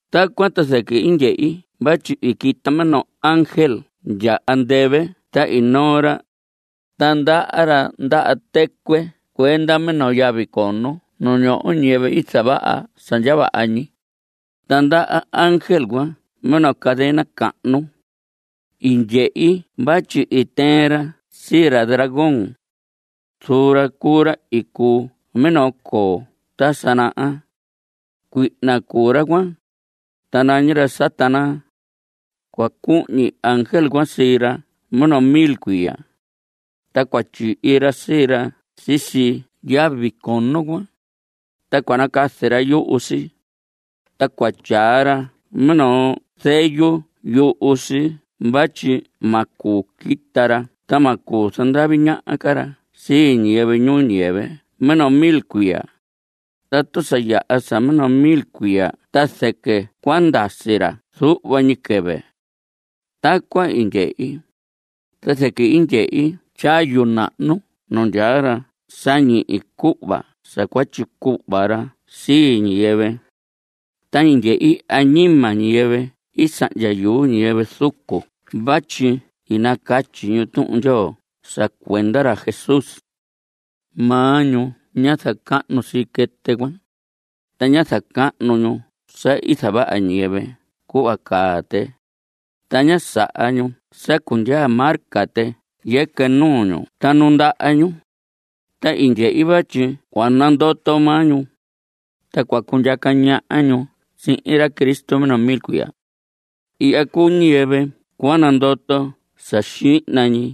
Tacuan ta zɨquɨ i ndyehi vatyi i quita minoo ángel ndya andɨvɨ ta i noo ra, ta ndaha ra ndaha tɨcuɨ cuenda minoo yavi cono nu ñoho ñiyɨvɨ i zavaha sa ndya vaha ñi, ta ndaha ángel cuan minoo cadena cahnu. I ndyehi vatyi tɨɨn ra sii ra dragón. Zuun ra cuu ra i cuu minoo coo ta sa naha. Cuihna cuu ra cuan, ta nañi ra Satanás. Cua cuhñi ángel cuan sii ra minoo mil cuiya. Ta cua tyihi ra sii ra sisi yavi cono cuan, ta cua nacazi ra yuhu si, ta cua tyaa ra minoo zeyu yuhu si vatyi ma cuu quita ra ta ma cuu zandavi ñaha ra sii ñiyɨvɨ ñuu ñiyɨvɨ minoo mil cuiya. Tatu sa yaha sa minoo mil cuiya cuan ta zɨquɨ cua ndasi ra zuhva ñi quɨvɨ. Tacuan i ndyehi, ta zɨquɨ i ndyehi tyayu nahnu nu ndyaa ra sa ñihi cuhva sa cua tyicuhva ra sii ñiyɨvɨ. Ta i ndyehi añima ñiyɨvɨ i sahndya yuu ñiyɨvɨ zucu vatyi i nacatyi ñu Tuhun Ndyoo sa cuenda ra Jesús. Maa ñu ñá zacahnu sii quɨtɨ cuan, ta ñá zacahnu ñu sa i zavaha ñiyɨvɨ cuhva caa tɨ. Ta ñá saha ñu sa cundyaa marca tɨ yɨquɨ nuu ñu ta nu ndaha ñu. Ta i ndyehi vatyi cua nandoto maa ñu, ta cua cundyaca ñaha ñu sihin ra Cristo minoo mil cuiya. Ihya cuu ñiyɨvɨ cua nandoto sa xihna ñi.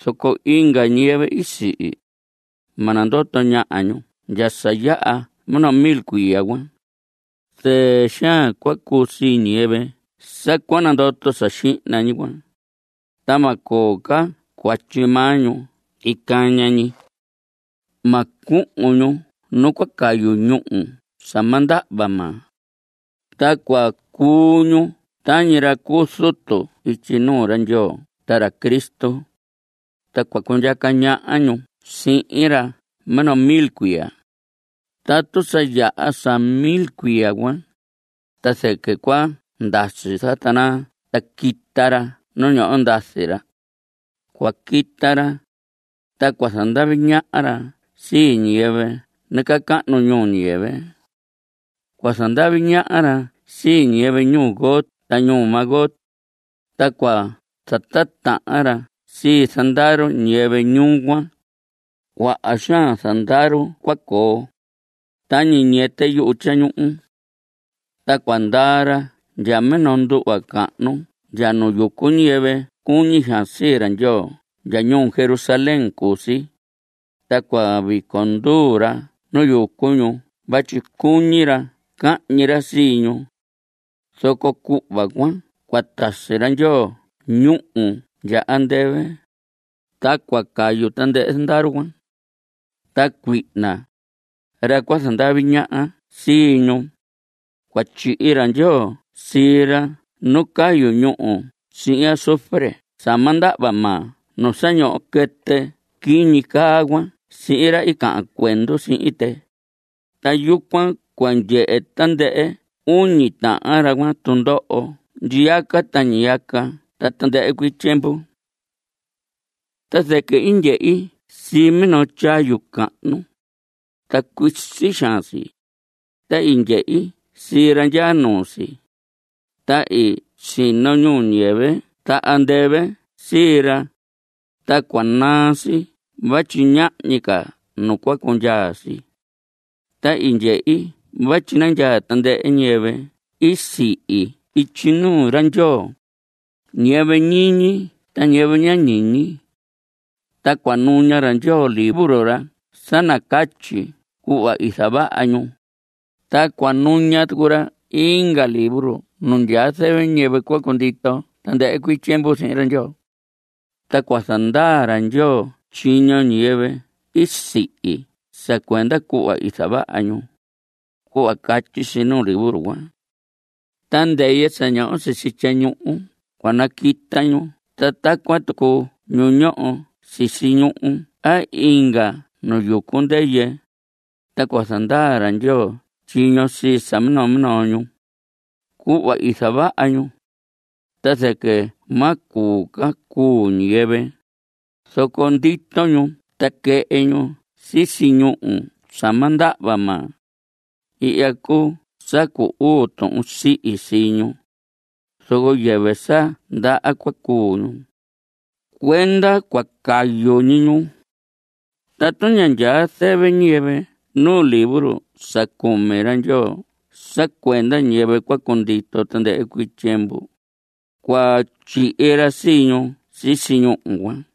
Zoco inga ñiyɨvɨ i sihi, ma nandoto ñaha ñu ndya sa yaha minoo mil cuiya cuan. Zɨɨ xaan cua cuu sii ñiyɨvɨ sa cua nandoto sa xihna ñi cuan, ta ma coo cuatyi maa ñu icaña ñi. Ma cuhun ñu nu cua cayu ñúhu sa ma ndahva maa. Ta cua cuu ñu tañi ra cu zutu ityi nuu ra Ndyoo ta ra Cristo, ta cua cundyaca ñaha ñu sihin ra minoo mil cuiya. Tatu sa yaha sa mil cuiya cuan, ta zɨquɨ cua ndasi Satanás ta quita ra nu ñoho ndazi ra. Cua quita ra, ta cua zandavi ñaha ra sii ñiyɨvɨ nacahnu ñuu ñiyɨvɨ. Cua zandavi ñaha ra sii ñiyɨvɨ ñuu Gog ta ñuu Magog, ta cua zatitahan ra sii zandaru ñiyɨvɨ ñuu cuan. Cuaha xaan zandaru ra cua coo, tañi ñiyɨtɨ yuhu tyañuhu. Ta cua ndaa ra ndya minoo nduhva cahnu ndya nu yucu ñiyɨvɨ cuñi xaan sii ra Ndyoo ndya ñuu Jerusalén cu si, ta cua vico nduu ra nu yucu ñu vatyi cuñi ra cahñi ra sii ñu. Zoco cuhva cuan cua tasi ra Ndyoo ñúhu ndya andɨvɨ, ta cua cayu tandɨhɨ zandaru cuan. Ta cuihna, ra cua zandavi ñaha sii ñu, cua tyihi ra Ndyoo sii ra nu cayu ñúhu sihin azufre sa ma ndahva maa nu sa ñoho quɨtɨ quiñi caa cuan sihin ra i cahan cuendu sihin tɨ. Ta yucuan cua ndyehe tandɨhɨ uñi tahan ra cuan tundoho ñiyaca ta ndyiyaca ta tandɨhɨ cuii tyiemvu. Ta zɨquɨ i ndyehi sii minoo tyayu cahnu, ta cuisi xaan si, ta i ndyehi sii ra ndyaa nuu si. Ta i sino ñuhu ñuu ñiyɨvɨ ta andɨvɨ sii ra, ta cua naa si vatyi ñahñi ca nu cua cundyaa si. Ta i ndyehi vatyi nandyaa tandɨhɨ ñiyɨvɨ i sihi ityi nuu ra Ndyoo, ñiyɨvɨ ñiñi ta ñiyɨvɨ ña ñiñi. Ta cua nuña ra Ndyoo libro ra sa nacatyi cuhva i zavaha ñu, ta cua nuña tucu ra inga libro nu ndyaa zɨvɨ ñiyɨvɨ cua cundito tandɨhɨ cuii tyiemvu sihin ra Ndyoo. Ta cua zandaa ra Ndyoo tyiño ñiyɨvɨ i sihi sa cuenda cuhva i zavaha ñu, cuhva catyi si nu libro cuan. Ta ndɨyɨ sa ñoho sisi tyañuhu cua naquita ñu ta tacuan tucu ñu ñoho sisi ñuhu a inga nu yucu ndɨyɨ, ta cua zandaa ra Ndyoo tyiño sii sa minoo minoo ñu, cuhva i zavaha ñu. Ta zɨquɨ ma cuu ca cuu ñiyɨvɨ, zoco ndito ñu ta quɨhɨ ñu sisi ñúhu sa ma ndahva maa. Ihya cuu sa cu uu tuhun sihi sii ñu, zoco yɨvɨ sa ndaha cua cuu ñu. Cuenda cua cayu ñi ñu. Tatu ña ndyaa zɨvɨ ñiyɨvɨ nu libro sa cumi ra Ndyoo sa cuenda ñiyɨvɨ cua cundito tandɨhɨ cuii tyiemvu, cua tyihi ra sii ñu sisi ñúhu cuan.